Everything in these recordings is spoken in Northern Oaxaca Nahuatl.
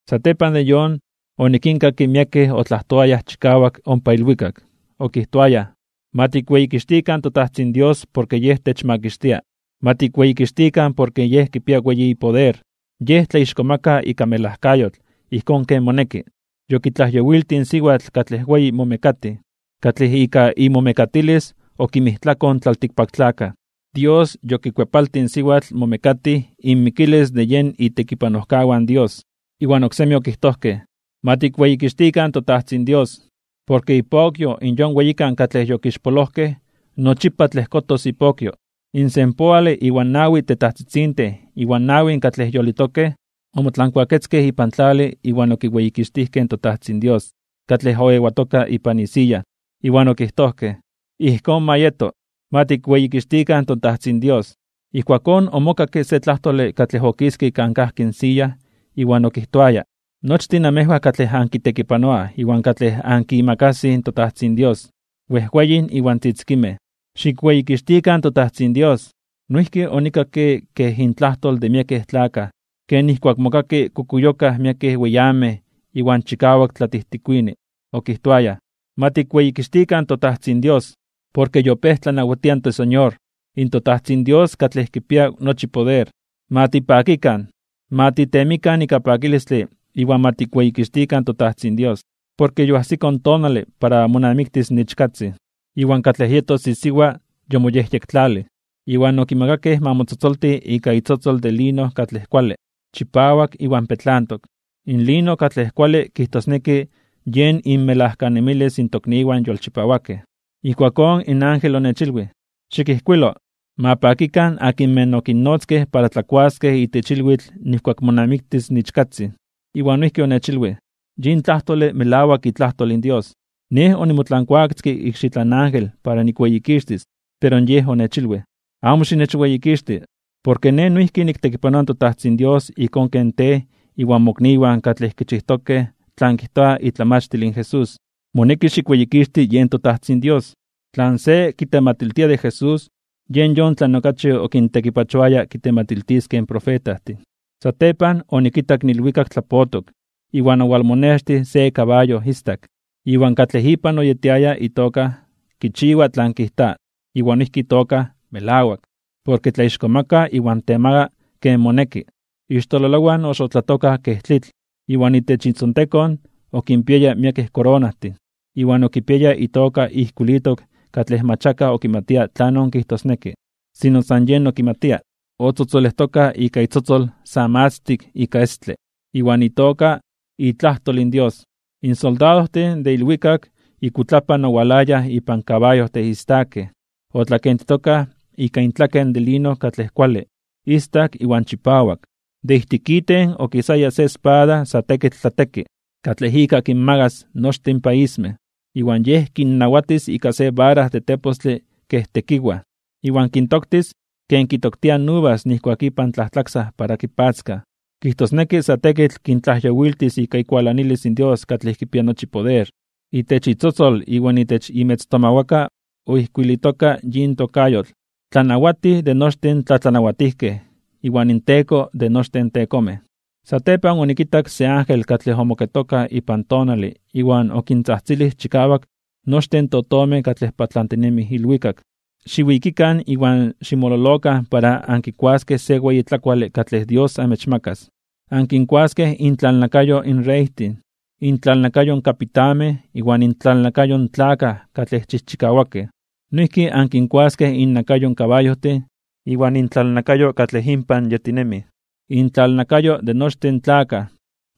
Satepan de yon, onikinkakke miekej otlajtoayaj chikawak ompa ilwikak. Okijtoayaj: Ma tikweyikixtikan in toTajtzin Dios porke Yej techmakixtia. Ma tikweyikixtikan porke Yej kipia weyi ipoder. Yej tlaixkomaka (tlatzonmanas) ika melajkayotl ijkón ken moneki. Yokitlajyowiltij in siwatl katlej weyi momekatij, katlej ika imomekatilis okinmijtlakoj in tlaltikpaktlakaj. Dios yokikuepaltij in siwatl momekatij inmikilis de yen itekipanojkawan in Dios. Iwan oksemi okijtojkej: ―¡Ma tikweyikixtikan toTajtzin Dios! Porke ipokyo in yon weyikan katlej yokixpolojkej nochipa tlejkotos ipokyo. In senpoale iwan nawi tetajtzitzintin iwan in nawin katlej yolitokej, omotlankuaketzkej ipan tlale iwan okiweyikixtijkej in toTajtzin Dios, katlej oewatoka ipan isiya. Iwan okijtojkej: ―¡Ijkón ma yeto! ¡Ma tikweyikixtikan toTajtzin Dios! Ijkuakón omokakke se tlajtole katlej okiske kan kajki in siya iwan okijtoaya: Nochtin namejwan katlej ankitekipanoaj iwan katlej ankimakasij in toTajtzin Dios, wejweyin iwan tzitzikinmej, xikweyikixtikan toTajtzin Dios. Noijki onikakke kej intlajtol de miekej tlakaj, ken nijkuak mokaki kukuyokaj miekej weyamej iwan chikawak tlatijtikuini. Okijtoayaj: ¡Ma tikweyikixtikan toTajtzin Dios! Porke yopéj tlanawatia in toSeñor, in toTajtzin Dios katlej kipia nochi poder. Ma tipakikan, ma titemikan ika pakilistle iwan ma tikweyikixtikan toTajtzin Dios, porke yoajsiko in tonale para monamiktis in Ichkatzin, iwan katlej yetos isiwa yomoyejyektlalij. Iwan okimakakej ma motzotzolti ika itzotzol de lino katlej kuale, chipawak iwan petlantok. Lino katlej kuale kijtosneki yen inmelajkanemilis in tokniwan yolchipawakej. Ijkuakón in ángel onechilwij: ―Xikijkuilo: “Ma pakikan akinmej okinnotzkej para tlakuaskej itech ilwitl nijkuak monamiktis in Ichkatzin.” Iwan noijki onechilwij: ―Yin tlajtole melawak itlajtol in Dios. Nej onimotlankuaketzke ikxitlan ángel para nikweyikixtis, pero yej onechilwij: ―Amo xinechweyikixti. Porke nej noijki niktekipanoa in toTajtzin Dios ijkón ken tej iwan mokniwan katlej kichijtokej tlan kijta itlamachtil in Jesús. Moneki xikweyikixti yen toTajtzin Dios. Tlan se kitematiltia de Jesús yen yon tlan okachi okintekipachoaya kitematiltiskej in profetajtin. Satepan onikitak in ilwikak tlapotok, iwan owalmonextij se kabayo istak. Iwan katlej ipan oyetiaya itoka Kichiwa Tlan Kijta iwan noijki itoka Melawak. Porke tlaixkomaka (tlatzonmana) iwan temaga (temaka) ken moneki. Ixtololowan oxotlatokaj kej tlitl, iwan itech itzontekon okinpiaya miekej koronajtin. Iwan okipiaya itoka ijkuilitok katlej mach akaj okimatia tlanon kijtosneki, sino san Yej okimatia. Otzotzolejtoka ika itzotzol sa matztik ika estle, iwan itoka Dios iTlajtol. In soldadojtin de ilwikak ikuitlapan owalayaj ipan kabayojtin istakej, otlakentitokaj ika intlaken de lino katlej kuale, istak iwan chipawak. De ijtik iten okisaya se espada sa tekitl tlateki, katlej ika kinmagas nochtin in paismej. Iwan Yej kinnawatis ika se vara de tepostle kej tekiwaj. Iwan kintoktis ken kitoktiaj in uvas nijkuak ipan tlajtlaksaj para kipatzkaj, kijtosneki sa tekitl kintlajyowiltis ika ikualanilis in Dios katlej kipia nochi poder. Itech itzotzol iwan itech imetztomawakan oijkuilitoka yin tokayotl: “Tlanawatij de nochtin tlatlanawatijkej iwan inTeko de nochtin tekomej.” Satepan onikitak se ángel katlej omoketoka ipan tonale iwan okintzajtzilij chikawak nochtin in totomej katlej patlantinemij ilwikak: ―Xiwikikan iwan ximololokan para ankikuaskej se weyi tlakuale katlej Dios amechmakas. Ankinkuaskej intlalnakayo in reytin, intlalnakayo in kapitanmej iwan intlalnakayo in tlakaj katlej chijchikawakej. Noijki ankinkuaskej innakayo in kabayojtin iwan intlalnakayo katlej inpan yetinemij, intlalnakayo de nochtin tlakaj,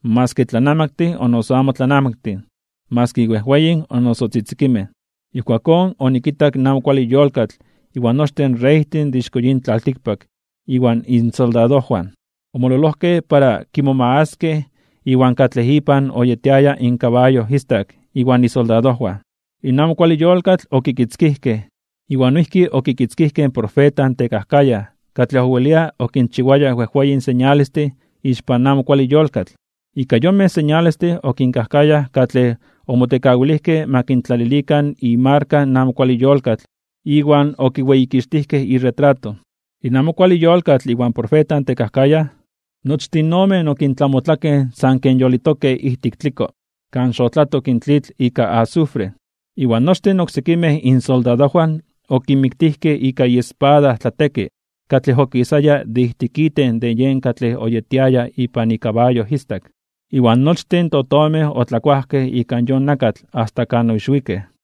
maski tlanamaktin o noso amo tlanamaktin, maski wejweyin o noso tzitzikinmej. Ijkuakón onikitak in amo kuale yolkatl iwan nochtin reytin de ixko yin tlaltikpak iwan insoldadojwan, omololojkej para kimomagaskej iwan katlej ipan oyetiaya in kabayo istak iwan isoldadojwan. In amo kuale yolkatl okikitzkijkej, iwan noijki okikitzkijkej in profeta tekajkayaj katlej owelia okinchiwaya wejweyin señalestin ixpan amo kuale yolkatl. Ika yonmej señalestin okinkajkayaj katlej omotekawilijkej ma kintlalilikan imarka in amo kuale yolkatl iwan okiweyikixtijkej iretrato. In amo kuale yolkatl iwan profeta tekajkayaj, nochtin omen okintlamotlakej san ken yolitokej ijtik tliko kan xotlatok in tlitl ika azufre. Iwan nochtin oksekimej insoldadojwan okinmiktijkej ika iespada tlateki katlej okisaya de ijtik iten de yen katlej oyetiaya ipan ikabayo istak. Iwan nochtin in totomej otlakuajkej ika yon nakatl asta kan oixwikej.